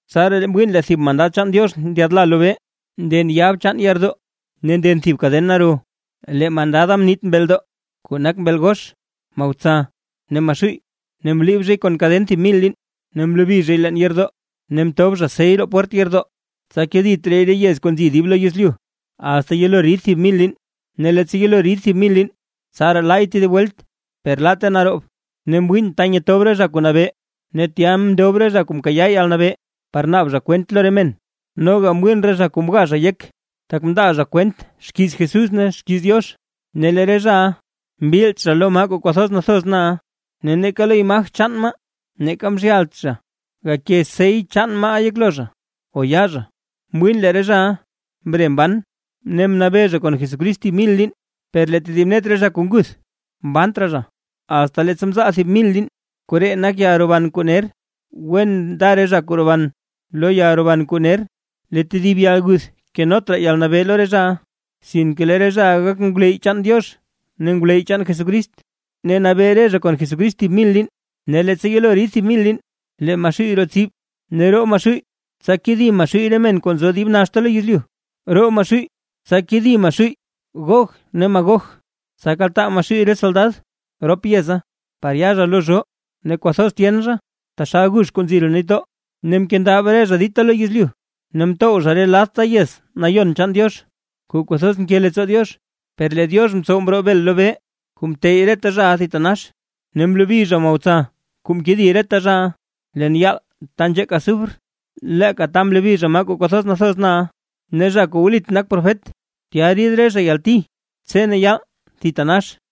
Tsaraa mwiin lee thib mandad chaan Diox ndyaadla lobee, nden yab chaan yeerdoo ne nden thib kaden naro. Lee mandada mniit mbeldoo, kuu nak mbeel gox, Mahotsa ne Maxuuy, ne mliib zhay kon kaden thib mil liin. Ne mlobi zhay leen yeerdoo, ne mtob zha sey roo pwert yeerdoo, tsa kedit raay re yez kuu nzi dib lo yezlyu, asta yelo rid thib mil liin. Ne leettsa yelo rid thib mil liin, tsaraa laay tedib welt, per laatte naroob. Ne mwiin ta nyetob re zha kuu nabee, ne tya mndob re zha kuu mkayaa yalnabee par naab zha kwent lo re men. Noga mwiin re zha kuu mga zha yek, tak mndaa zha kwent xkiiz Jesús ne xkiiz Diox. Ne lee re zhaʼa mbilt zha lo maa kuu kwathoz nathoz na ne neeka lo imaj chaan maaʼa, neeka mzhyalt zha gake sey maaʼa yeklo zha o yaa zha. Mwiin lee re zhaʼa mre mban ne mnabee zha kon Jesucrist thib mil liin. Per lee tedib net re zha kuu nguth, mbant raa zha, asta leettsa mzaal thib mil liin. Koree nak yalroban kuu ner. ¡Wen nda re zha kuu roban lo yalroban kuu ner! Lee tedib yalguth kenot raa yalnabee lo re zhaʼa, sinke lee re zhaʼa gak ngwleyy chaan Diox ne ngwleyy Jesucrist, ne nabee re zha kon Jesucrist thib mil liin. Ne leettsa yelo rid thib mil liin, lee Maxuuy roo tsib, ne roo Maxuuy, tsa kedi Maxuuy re men kuu nzo dib naxta lo yezlyu. Roo Maxuuy, tsa kedi Maxuuy Gog ne Magog, tsa kaltaa Maxuuy re soldad rop yeza par ya zha lo zhoo, ne kwathoz tyen zha, taxal gux kuu nzi roo nitdoo. Ne mkendab re zha dita lo yezlyu, ne mtow zha re ladta yez nayon chaan Diox, kuu kwathoz nke leettsoo Diox. Per lee Diox mtsow mroo bel lobee kuu mteyy reta zhaʼa thitanax. Ne mlobi zha Mahotsa kuu mkedi reta zhaʼa, leen yaal taa nzheek azufre, leeka ta mlobi zha maa kuu kwathoz nathoz na ne zha kuu wlit nak profet. Tya rid re zha yalti tse ne yaal thitanax.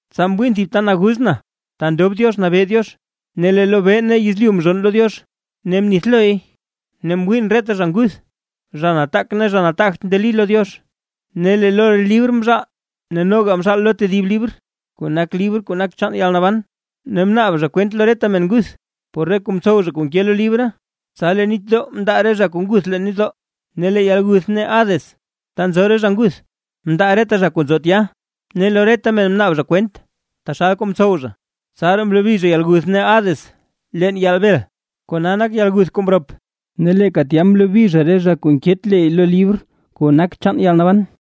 Tsa mwiin thib ta naguz na, ta ndob Diox nabee Diox. Ne lee lobee ne yezlyu mzhonn lo Diox, ne mnithloy. Ne mwiin reta zha nguth, zha nataak ne zha nataagt ndeli lo Diox; ne lee lo re libr mzhaal. Ne noga mzhaal lo tedib libr, kuu nak libr kuu nak chaan yalnaban. Ne mnaab zha kwent lo reta men nguth, por re kuu mtsow zha kuu nke lo re libra. Tsa lee nitdoo mndaa re zha kuu nguth leen nitdoo, ne lee yalguth ne Hades ta nzo re nguth, mndaa reta zha kuu nzo tya; ne lo reta men mnaab zha kwent taxal kuu mtsow zha. Tsaraa mlobi zha yalguth ne Hades leen yaal bel. Kona gak yalguth kuu mrop, ne leeka tya mlobi zha re zha kuu nket le lo libr kuu nak chaan yalnaban.